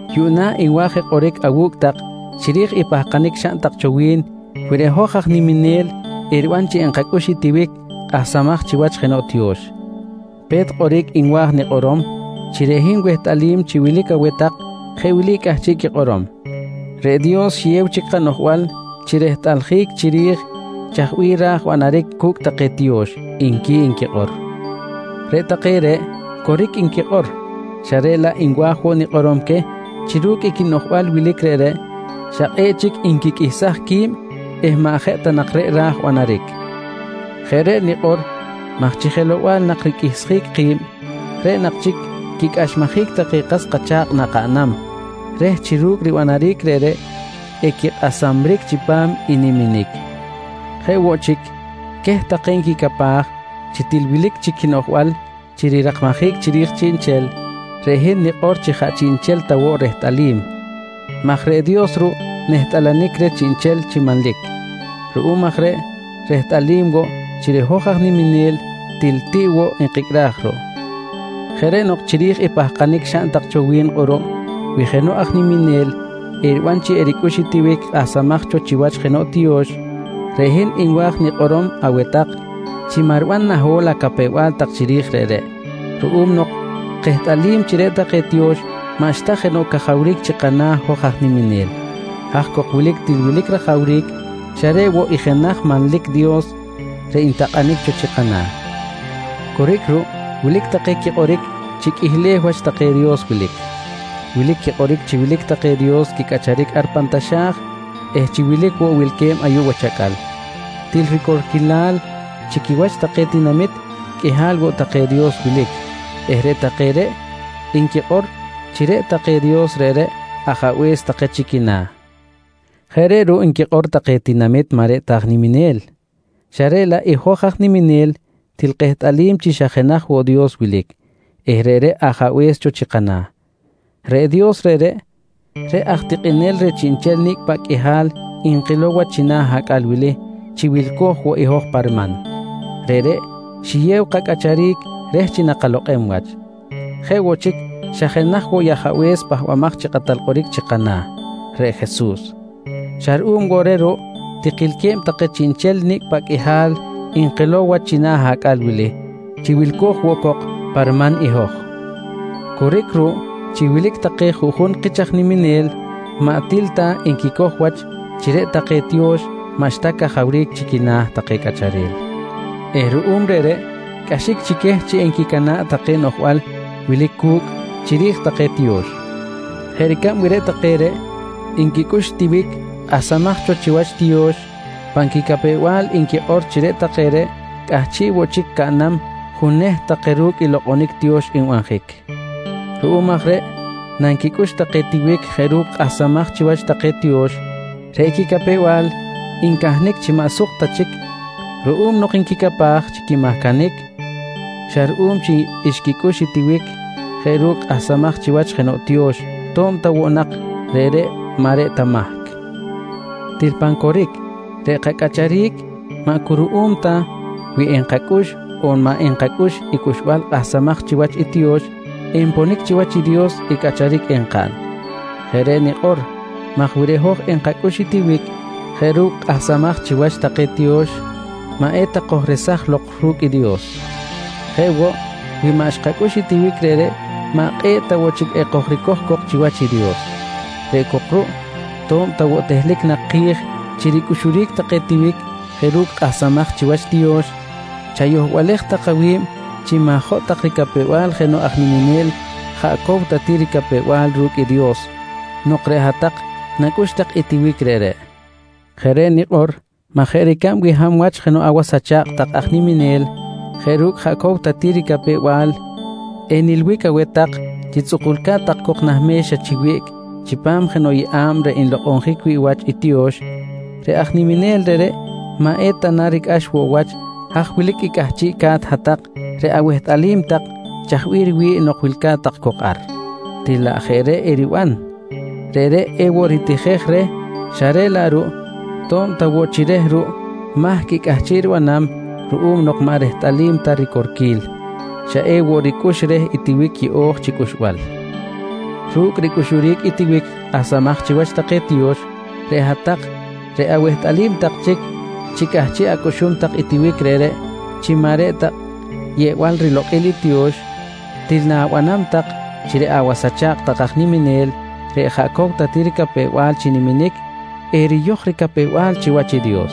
Yuꞌna nwa̱j je kꞌoric awu̱cꞌ tak chiri̱j i pahkanic xaꞌn tak cho wi̱n wi reꞌ hoj aj niminel eriban chi enkacꞌux i tiwic kꞌahsamaj chiwach jenoꞌ tiyo̱x. Pe̱t kꞌoric nwa̱j nikꞌorom chi reꞌ hin wehtꞌalim chi wilic aweh tak jeꞌ wili cꞌahchiꞌ quikꞌorom: «Reꞌ Dios xiyew chic kanoꞌjbal chi rehtꞌaljic chiri̱j chaj bih ra̱j banaric cu̱cꞌ take tiyo̱x, nqui nquikꞌor. Reꞌ take reꞌ coric nquikꞌor, xa reꞌ laꞌ nwa̱j woꞌ nikꞌorom queh chi ru̱cꞌ i quinoꞌjbal wilic reꞌreꞌ, xa kꞌe̱ꞌ chic nquiqꞌuihsaj qui̱b eh maꞌ jeꞌ ta nak reꞌ raj banaric. Jeꞌ reꞌ nikꞌor maj chi jelow-bal nak riqꞌuihsjic ki̱b, reꞌ nak chic quicꞌaxmajic take kas kacha̱kꞌ nakaꞌnam reh chi ru̱cꞌ ribanaric reꞌreꞌ equikꞌasamric chipam i niminic. Jeꞌ woꞌ chic, queh take nquicapaj chi til wilic chic quinoꞌjbal chi rirakmajic chiri̱j chiꞌnchel, reꞌ hin nikꞌor chi jaꞌ chiꞌnchel ta woꞌ rehtꞌalim maj reꞌ Dios ruꞌ nehtꞌalanic reh chiꞌnchel chi manlic. Ruꞌum aj reꞌ rehtalil woꞌ chi reꞌ hoj aj nimimel til tiꞌ woꞌ nkicꞌraj ruꞌ. Jeꞌ reꞌ nok chiri̱j i pahkanic xaꞌn tak cho wi̱n kꞌuruꞌ wi jenoꞌ aj niminel eriban chi ericꞌux i tiwic kꞌahsamaj cho chiwach jenoꞌ tiyo̱x, reꞌ hin nwa̱j nikꞌorom aweh tak chi maꞌ riban naho̱l acapew-bal tak chiri̱j reꞌreꞌ, ruꞌum nok kehtꞌalim chi reꞌ take tiyo̱x maꞌxta jenoꞌ cajawric chi kana̱ hoj aj niminel. Haj cok wilic til wilic rajawric xa reꞌ woꞌ i jenaj manlic Dios reꞌ ntakꞌanic cho chi kana̱. Coric ruꞌ, wilic take quikꞌoric chi qꞌuihleh wach take dios wilic. Wilic quikꞌoric chi wilic take dios quicꞌacharic ar pan taxa̱j eh chi wilic woꞌ wilque̱b ayuꞌ wach acꞌal. Til ricorquilal chi quiwach take tinamit qꞌuihal woꞌ take dios wilic eh reꞌ take reꞌ nquikꞌor chi reꞌ take dios reꞌreꞌ, ajabe̱s take chi quina̱. Jeꞌ reꞌ ruꞌ nquikꞌor take tinamit maꞌ reꞌ ta take aj niminel, xa reꞌ laꞌ i hoj aj niminel til kehtꞌalim chi xa jenaj woꞌ Dios wilic eh reꞌreꞌ Ajabe̱s cho chi kana̱. Reꞌ Dios reꞌreꞌ, reꞌ aj tikꞌinel reh chiꞌnchel nicꞌ paꞌ qꞌuihal nkilow wach china̱ acꞌal wili chi wilco̱j woꞌ i hoj pa riman, reꞌreꞌ xiyew kacꞌacharic reh chi nakalokꞌem wach. Jeꞌ woꞌ chic xa jenaj woꞌ i Ajabe̱s Pahbamaj chi Kꞌatal Kꞌoric chi kana̱, reꞌ Jesus. Xa ruꞌum woꞌ reh ruꞌ tikilque̱b take chiꞌnchel nicꞌ paꞌ qꞌuihal nkilow wach china̱ acꞌal wili chi wilco̱j woꞌ cok pa riman i hoj. Coric ruꞌ chi wilic take juꞌjun kich aj niminel maꞌ til ta nquicoj wach chi reꞌ take tiyo̱x maꞌxta cajawric chi quina̱ take cꞌacharel eh ruꞌum reꞌreꞌ cꞌaxic chi queh chi enquicana̱ꞌ take noꞌjbal wilic cu̱cꞌ chiri̱j take tiyo̱x. Jeꞌ ricab wi reꞌ take reꞌ nquicꞌux tiwic kꞌahsamaj cho chiwach tiyo̱x, pan quicapew-bal nquikꞌor chi reꞌ take reꞌ cꞌahchiꞌ woꞌ chic caꞌnam juneht take ru̱cꞌ i lokꞌonic tiyo̱x nbanjic. Ruꞌum aj reꞌ nanquicꞌux take tiwic jeꞌ ru̱cꞌ kꞌahsamaj chiwach take tiyo̱x, reꞌ quicapew-bal ncahnic chi maꞌ suk tak chic ruꞌum nok nquicapaj chi quimahcanic xa ruꞌum chi xquicꞌux tiwic jeꞌ ru̱cꞌ kꞌahsamaj chiwach jenoꞌ tiyo̱x, to̱b ta woꞌ nak reꞌreꞌ maꞌ reꞌ ta mahc. Til pan coric reꞌ kacꞌacharic, maꞌ cu ruꞌum ta wi enkacꞌux on maꞌ enkacꞌux i cꞌuxbal kꞌahsamaj chiwach i tiyo̱x enponic chiwach i Dios i cꞌacharic enkaꞌn. Jeꞌ reꞌ nikꞌor maj wi reꞌ hoj enkacꞌux i tiwic jeꞌ ru̱cꞌ kꞌahsamaj chiwach take tiyo̱x, maꞌ eta kojresaj lok ru̱cꞌ i Dios. Jeꞌ woꞌ, wi maꞌ xkacꞌux i tiwic reꞌreꞌ maꞌ kꞌe̱ꞌ ta woꞌ chic ekojricoj cok chiwach i Dios. Reꞌ cok ruꞌ to̱b ta woꞌ tehlic nak ki̱j chi ricꞌuxuric take tiwic jeꞌ ru̱cꞌ kꞌahsamaj chiwach tiyo̱x, chayohbalej tak awi̱b chi ma̱jotꞌ tak ricapew-bal jenoꞌ aj niminel jaꞌ cow ta ti ricapew-bal ru̱cꞌ i Dios nok reꞌ hat-tak nacꞌux tak i tiwic reꞌreꞌ. Jeꞌ reꞌ nikꞌor maj jeꞌ ricab wi hab wach jenoꞌ awas acha̱kꞌ tak aj niminel jeꞌ ru̱cꞌ jaꞌ cow ta ti ricapew-bal enilbic aweh tak chi tzꞌukulca̱t tak cok nah me̱xa chi wiꞌc chipam jenoꞌ yeꞌa̱b reꞌ nlokꞌonjic wi̱ꞌ wach i tiyo̱x, reꞌ aj niminel reꞌreꞌ maꞌ eta na ricꞌax woꞌ wach haj wilic i cꞌahchiꞌca̱t hat-tak reꞌ awehtꞌalim tak chaj bih riwi̱ꞌ nok wilca̱t tak cok ar? Til laꞌ jeꞌ reꞌ eriban, reꞌreꞌ ewoꞌ ritijej reh xa reꞌ laꞌ ruꞌ to̱b ta woꞌ chi reh ruꞌ mahc i cꞌahchiꞌ ribanam ruꞌum nok maꞌ rehtꞌalim ta ricorquil, xa ewoꞌ ricꞌux reh i tiwic yeꞌo̱j chi cꞌuxbal. Ru̱cꞌ i ricꞌuxuric i tiwic kꞌahsamaj chiwach take tiyo̱x, reꞌ hat-tak reꞌ awehtꞌalim tak chic chi cꞌahchiꞌ acꞌuxum tak i tiwic reꞌreꞌ chi maꞌ reꞌ ta yeꞌbal rilokꞌil i tiyo̱x, til na̱banam tak chi reꞌ awas acha̱kꞌ tak aj niminel reꞌ jaꞌ cow ta ti ricapew-bal chi niminic, eriyoj ricapew-bal chiwach i Dios.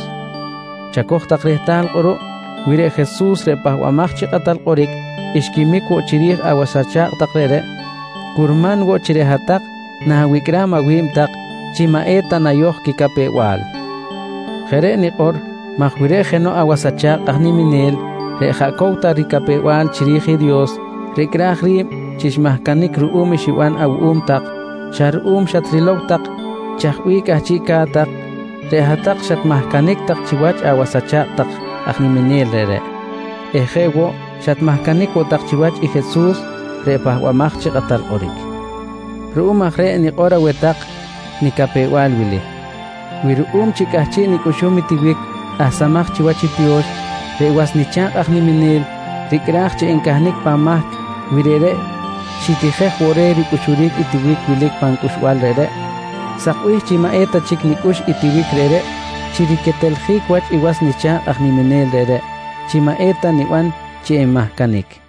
Chacoj tak rehtal kꞌuruꞌ wi reꞌ Jesus reꞌ Pahbamaj chi Kꞌatal Kꞌoric xquimic woꞌ chiri̱j awas acha̱kꞌ tak reꞌreꞌ, curman woꞌ chi reꞌ hat-tak na̱wicꞌram awi̱b tak chi maꞌ eta nayoj quicapew-bal. Jeꞌ reꞌ nikꞌor maj wi reꞌ jenoꞌ awas acha̱kꞌ aj niminel reꞌ jaꞌ cow ta ricapew-bal chiri̱j i Dios ricꞌraj ri̱b chi xmahcanic ruꞌum i xiban awuꞌum tak xa ruꞌum xatrilow tak chaj bih cꞌahchiꞌca̱t tak, reꞌ hat-tak xatmahcanic tak chiwach awas acha̱kꞌ tak aj niminel reꞌreꞌ eh jeꞌ woꞌ xatmahcanic woꞌ tak chiwach i Jesus reꞌ Pahbamaj chi Kꞌatal Kꞌoric. Ruꞌum aj reꞌ nikꞌor aweh tak nicapew-bal wili: Wi ruꞌum chi cꞌahchiꞌ nicꞌuxum i tiwic kꞌahsamaj chiwach i tiyo̱x, reꞌ was nicha̱kꞌ aj niminel ricꞌraj chi encahnic pan mahc wi reꞌreꞌ xitijej woꞌ reh ricꞌuxuric i tiwic wilic pan cꞌuxbal reꞌreꞌ, sakbih chi maꞌ eta chic nicꞌux i tiwic reꞌreꞌ chi riqueteljic wach i was nicha̱kꞌ aj niminel reꞌreꞌ, chi maꞌ eta niban chi enmahcanic.